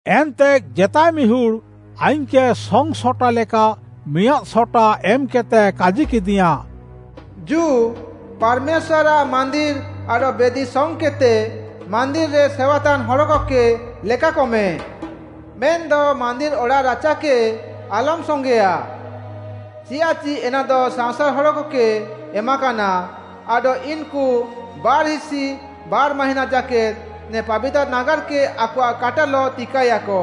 ଏନ୍ତେ ଜେତାଏ ମିହୁଡ଼୍‌ ଆଇଙ୍ଗ୍‌କେ ସଙ୍ଗ୍‌ସଟା ଲେକା ମିଆଁଦ୍‌ ସଟା ଏମ୍‌କେଦ୍‌ତେ କାଜିକେଦିୟାଁ, “ଜୁ, ପାର୍‌ମେଶ୍ୱାର୍‌ଆଃ ମାନ୍ଦିର୍‌ ଆଡଃ ବେଦି ସଙ୍ଗ୍‌କେଦ୍‌ତେ, ମାନ୍ଦିର୍‌ରେ ସେୱାତାନ୍‌ ହଡ଼କକେ ଲେକାକମେ। ମେନ୍‌ଦ ମାନ୍ଦିର୍‌ ଅଡ଼ାଃରାଚାକେ ଆଲମ୍‌ ସଙ୍ଗେଁୟା। ଚିୟାଃଚି ଏନାଦ ସାଅଁସାର୍‌ ହଡ଼କକେ ଏମାକାନା ଆଡଃ ଇନ୍‌କୁ ବାର୍‌ହିସି ବାର୍‌ ମାହିଁନା ଜାକେଦ୍‌ ନେ ପାବିତାର୍‌ ନାଗାର୍‌କେ ଆକଆଃ କାଟାଲଃ ତିକାଏୟାକ।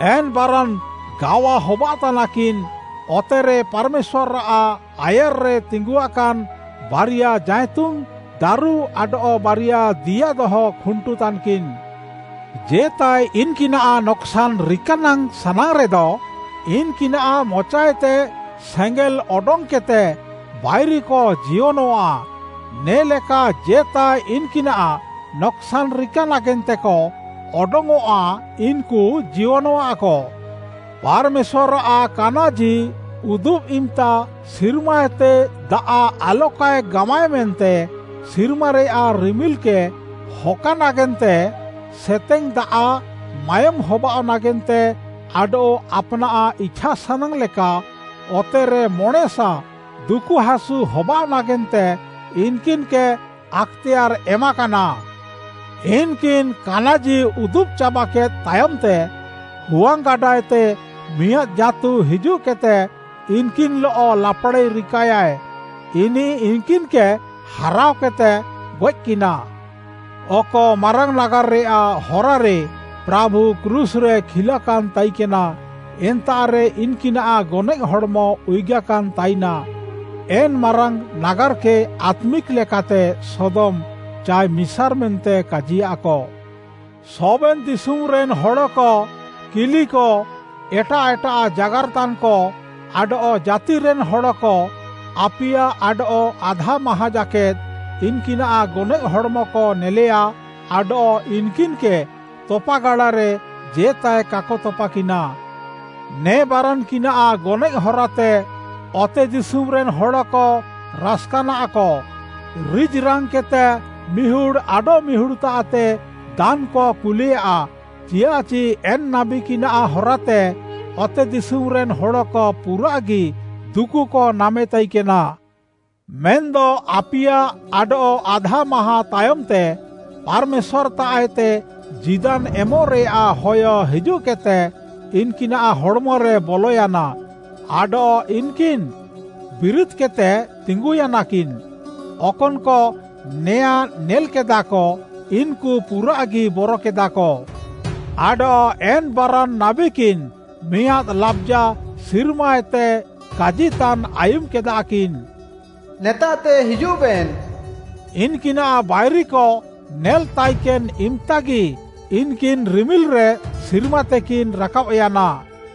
ଏନ୍‌ ବାରାନ୍‌ ଗାୱା ହବାଅଃତାନାକିନ୍‌, ଅତେରେ ପାର୍‌ମେଶ୍ୱାର୍‌ଆଃ ଆୟାର୍‌ରେ ତିଙ୍ଗୁଆକାନ୍‌ ବାରିୟା ଜାଇତୁନ୍‌ ଦାରୁ ଆଡଃ ବାରିୟା ଦିଆ ଦହ ଖୁଣ୍ଟୁ ତାନ୍‍କିନ୍‌। ଜେତାଏ ଇନ୍‌କିନାଃ ନକ୍‌ସାନ୍‌ ରିକା ନାଙ୍ଗ୍‌ ସାନାଙ୍ଗ୍‌ରେଦ, ଇନ୍‌କିନାଃ ମଚାଏତେ ସେଙ୍ଗେଲ୍‌ ଅଡଙ୍ଗ୍‌କେଦ୍‌ତେ ବାଇରିକ ଜିୟନଃଆ। ନେ'ଲେକା ଜେତାଏ ଇନ୍‌କିନାଃ ନକ୍‌ସାନ୍‌ ରିକା ନାଗେନ୍ତେକ ଅଡଙ୍ଗ୍‌ଅଃଆ, ଇନ୍‌କୁ ଜିୟନଃଆକ। ପାର୍‌ମେଶ୍ୱାର୍‌ଆଃ କାନାଜି ଉଦୁବ୍‌ ଇମ୍‌ତା ସିର୍ମାଏତେ ଦାଆଃ ଆଲକାଏ ଗାମାଏ ମେନ୍ତେ, ସିର୍ମାରେୟାଃ ରିମିଲ୍‌କେ ହକା ନାଗେନ୍ତେ, ସେତେଙ୍ଗ୍‌ ଦାଆଃ, ମାୟୋମ୍‌ ହବାଅଃ ନାଗେନ୍ତେ ଆଡଃ ଆପାନାଃ ଇଛାସାନାଙ୍ଗ୍‌ ଲେକା ଅତେରେ ମଣେଁସା ଦୁକୁହାସୁ ହବାଅଃ ନାଗେନ୍ତେ ଇନ୍‌କିନ୍‌କେ ଆକ୍‌ତେୟାର୍‌ ଏମାକାନା। ଇନ୍‌କିନ୍‌ କାନାଜି ଉଦୁବ୍‌ ଚାବାକେଦ୍‌ ତାୟମ୍‌ତେ, ହୁଆଙ୍ଗ୍‌ଗାଡ଼ାଏତେ ମିଆଁଦ୍‌ ଜାଁତୁ ହିଜୁଃକେଦ୍‌ତେ, ଇନ୍‌କିନ୍‌ଲଃ ଲାପ୍‌ଡ଼ାଇ ରିକାଏୟାଏ। ଇନିଃ ଇନ୍‌କିନ୍‌କେ ହାରାଅକେଦ୍‌ତେ ଗଏଃକିନା। ଅକ ମାରାଙ୍ଗ୍‌ ନାଗାର୍‌ରେୟାଃ ହରାରେ ପ୍ରାଭୁ କ୍ରୁଶ୍‌ରେ କିଲାକାନ୍‌ ତାଇକେନା, ଏନ୍ତାଃରେ ଇନ୍‌କିନାଃ ଗନଏଃ ହଡ଼୍‌ମ ଉୟୁଗାକାନ୍‌ ତାଇନା। ଏନ୍‌ ମାରାଙ୍ଗ୍‌ ନାଗାର୍‌କେ ଆତ୍ମିକ୍‌ ଲେକାତେ ସୋଦମ୍‌ ଚାଏ ମିସାର୍‌ ମେନ୍ତେ କାଜିୟାଃକ। ସବେନ୍‌ ଦିଶୁମ୍‌ରେନ୍‌ ହଡ଼କ, କିଲିକ, ଏଟାଃ ଏଟାଃ ଜାଗାର୍‌ତାନ୍‌କ, ଆଡଃ ଜାତିରେନ୍‌ ହଡ଼କ ଆପିୟା ଆଡଃ ଆଧା ମାହାଁଁ ଜାକେଦ୍‌ ଇନ୍‌କିନାଃ ଗନଏଃ ହଡ଼୍‌ମକ ନେଲେୟା ଆଡଃ ଇନ୍‌କିନ୍‌କେ ତପାଗାଡ଼ାରେ ଜେତାଏ କାକ ତପାକିନା। ନେ ବାରାନ୍‌କିନାଃ ଗନଏଃ ହରାତେ ଅତେଦିଶୁମ୍‌ରେନ୍‌ ହଡ଼କ ରାସ୍‌କାନାଃକ, ରିଜ୍‌ରାଙ୍ଗ୍‌କେଦ୍‌ତେ ମିହୁଡ଼୍‌ ଆଡଃମିହୁଡ଼୍‌ତାଃତେ ଦାନ୍‌କ କୁଲେୟା। ଚିଆଃଚି ଏନ୍‌ ନାବୀକିନାଃ ହରାତେ ଅତେଦିଶୁମ୍‌ରେନ୍‌ ହଡ଼କ ପୁରାଃଗି ଦୁକୁକ ନାମେ ତାଇକେନା। ମେନ୍‌ଦ ଆପିୟା ଆଡଃ ଆଧା ମାହାଁଁ ତାୟମ୍‌ତେ ପାର୍‌ମେଶ୍ୱାର୍‌ତାଃଏତେ ଜୀଦାନ୍‌ ଏମଃରେୟାଃ ହୟ ହିଜୁଃକେଦ୍‌ତେ ଇନ୍‌କିନାଃ ହଡ଼୍‌ମରେ ବଲୟାନା ଆଡଃ ଇନ୍‌କିନ୍‌ ବିରିଦ୍‌କେଦ୍‌ତେ ତିଙ୍ଗୁୟାନାକିନ୍‌। ଅକନ୍‌କ ନେଆଁ ନେଲ୍‌କେଦାକ, ଇନ୍‌କୁ ପୁରାଃଗି ବରକେଦାକ। ଆଡଃ ଏନ୍‌ ବାରାନ୍‌ ନାବୀକିନ୍‌ ମିଆଁଦ୍‌ ଲାବ୍‌ଜା ସିର୍ମାଏତେ କାଜିତାନ୍‌ ଆୟୁମ୍‌କେଦାକିନ୍‌, “ନେତାଃତେ ହିଜୁଃବେନ୍‌!” ଇନ୍‌କିନାଃ ବାଇରିକ ନେଲ୍‌ ତାଇକେନ୍‌ ଇମ୍‌ତାଗି ଇନ୍‌କିନ୍‌ ରିମିଲ୍‌ରେ ସିର୍ମାତେକିନ୍‌ ରାକାବ୍‌ୟାନା।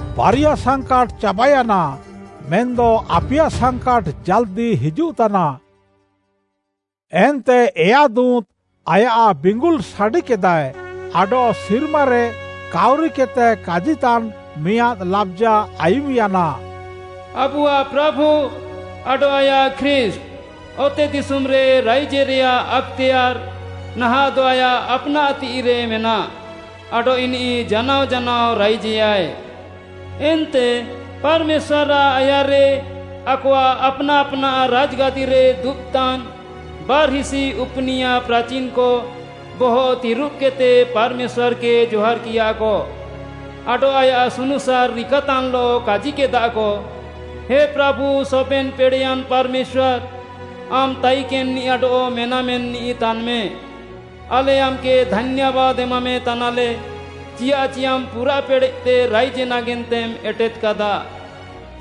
ବାରିୟା ସାଙ୍କାଟ୍‌ ଚାବାୟାନା, ମେନ୍‌ଦ ଆପିୟା ସାଙ୍କାଟ୍‌ ଜାଲ୍‌ଦି ହିଜୁଃତାନା। ଏନ୍ତେ ଏୟା ଦୁଁତ୍‌ ଆୟାଃ ବିଙ୍ଗୁଲ୍‌ ସାଡ଼ିକେଦାଏ, ଆଡଃ ସିର୍ମାରେ କାଉରିକେଦ୍‌ତେ କାଜିତାନ୍‌ ମିଆଁଦ୍‌ ଲାବ୍‌ଜା ଆୟୁମ୍‌ୟାନା, “ଆବୁଆଃ ପ୍ରାଭୁ ଆଡଃ ଆୟାଃ ଖ୍ରୀଷ୍ଟ୍‌ ଅତେଦିଶୁମ୍‌ରେ ରାଇଜେରେୟାଃ ଆକ୍‌ତେୟାର୍‌ ନାହାଃଁଦ ଆୟାଃ ଆପ୍‌ନାଃ ତିଃଇରେ ମେନାଃ, ଆଡଃ ଇନିଃ ଜାନାଅ ଜାନାଅ ରାଇଜେୟାଏ। ଏନ୍ତେ ପାର୍‌ମେଶ୍ୱାର୍‌ଆଃ ଆୟାର୍‌ରେ ଆକଆଃ ଆପ୍‌ନାଃ ଆପ୍‌ନାଃ ରାଜ୍‌ଗାଦିରେ ଦୁବ୍‌ତାନ୍‌ ବାର୍‌ହିସି ଉପୁନିୟା ପ୍ରାଚିନ୍‌କ ବହଃ ତିରୁବ୍‌କେଦ୍‌ତେ ପାର୍‌ମେଶ୍ୱାର୍‌କେ ଜହାର୍‌କିୟାକ ଆଡଃ ଆୟାଃ ସୁନୁସାର୍‌ ରିକାତାନ୍‌ଲଃ, କାଜିକେଦାକ, “ହେ ପ୍ରାଭୁ, ସବେନ୍‌ ପେଡ଼େୟାନ୍‌ ପାର୍‌ମେଶ୍ୱାର୍‌, ଆମ୍‌ ତାଇକେନ୍‌ନିଃ ଆଡଃ ମେନାମେନିଃ ତାନ୍‌ମେ, ଆଲେ ଆମ୍‌କେ ଧାନ୍ୟାବାଦ୍‌ ଏମାମେତାନାଲେ, ଚିଆଃଚି ଆମ୍‌ ପୁରାଃ ପେଡ଼େଃତେ ରାଇଜେ ନାଗେନ୍ତେମ୍‌ ଏଟେଦ୍‌କାଦା।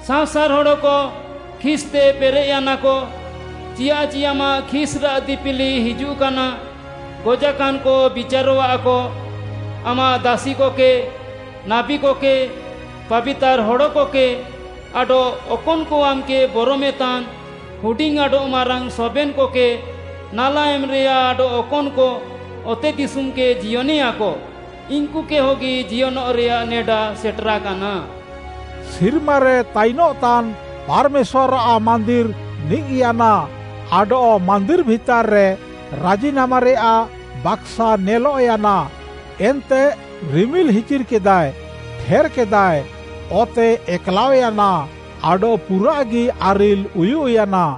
ସାଅଁସାର୍‌ ହଡ଼କ ଖିସ୍‍ତେ ପେରେଃୟାନାକ, ଚିୟାଃଚି ଆମାଃ ଖିସ୍‌ରାଃ ଦିପିଲି ହିଜୁଃକାନା, ଗଜାକାନ୍‍କ ବିଚାରଃଆକ। ଆମାଃ ଦାସିକକେ, ନାବୀକକେ, ପାବିତାର୍‌ ହଡ଼କକେ ଆଡଃ ଅକନ୍‌କ ଆମ୍‌କେ ବରମେତାନ୍‌ ହୁଡିଙ୍ଗ୍‌ ଆଡଃ ମାରାଙ୍ଗ୍‌ ସବେନ୍‌କକେ ନାଲା ଏମ୍‌ରେୟାଃ ଆଡଃ ଅକନ୍‌କ ଅତେଦିଶୁମ୍‌କେ ଜିୟନେୟାକ, ଇନ୍‌କୁକେ ହଗି ଜିୟନଃରେୟାଃ ନେଡା ସେଟେରାକାନା।” ସିର୍ମାରେ ତାଇନଃତାନ୍‌ ପାର୍‌ମେଶ୍ୱାର୍‌ଆଃ ମାନ୍ଦିର୍‌ ନିଜ୍‌ୟାନା ଆଡଃ ମାନ୍ଦିର୍‌ ଭିତାର୍‌ରେ ରାଜିନାମାରେୟାଃ ବାକ୍‌ସା ନେଲଃୟାନା। ଏନ୍ତେ ରିମିଲ୍‌ ହିଚିର୍‌କେଦାଏ, ଠେର୍‌କେଦାଏ, ଅତେ ଏକ୍‌ଲାଅୟାନା ଆଡଃ ପୁରାଃଗି ଆରିଲ୍‌ ଉୟୁଃୟାନା।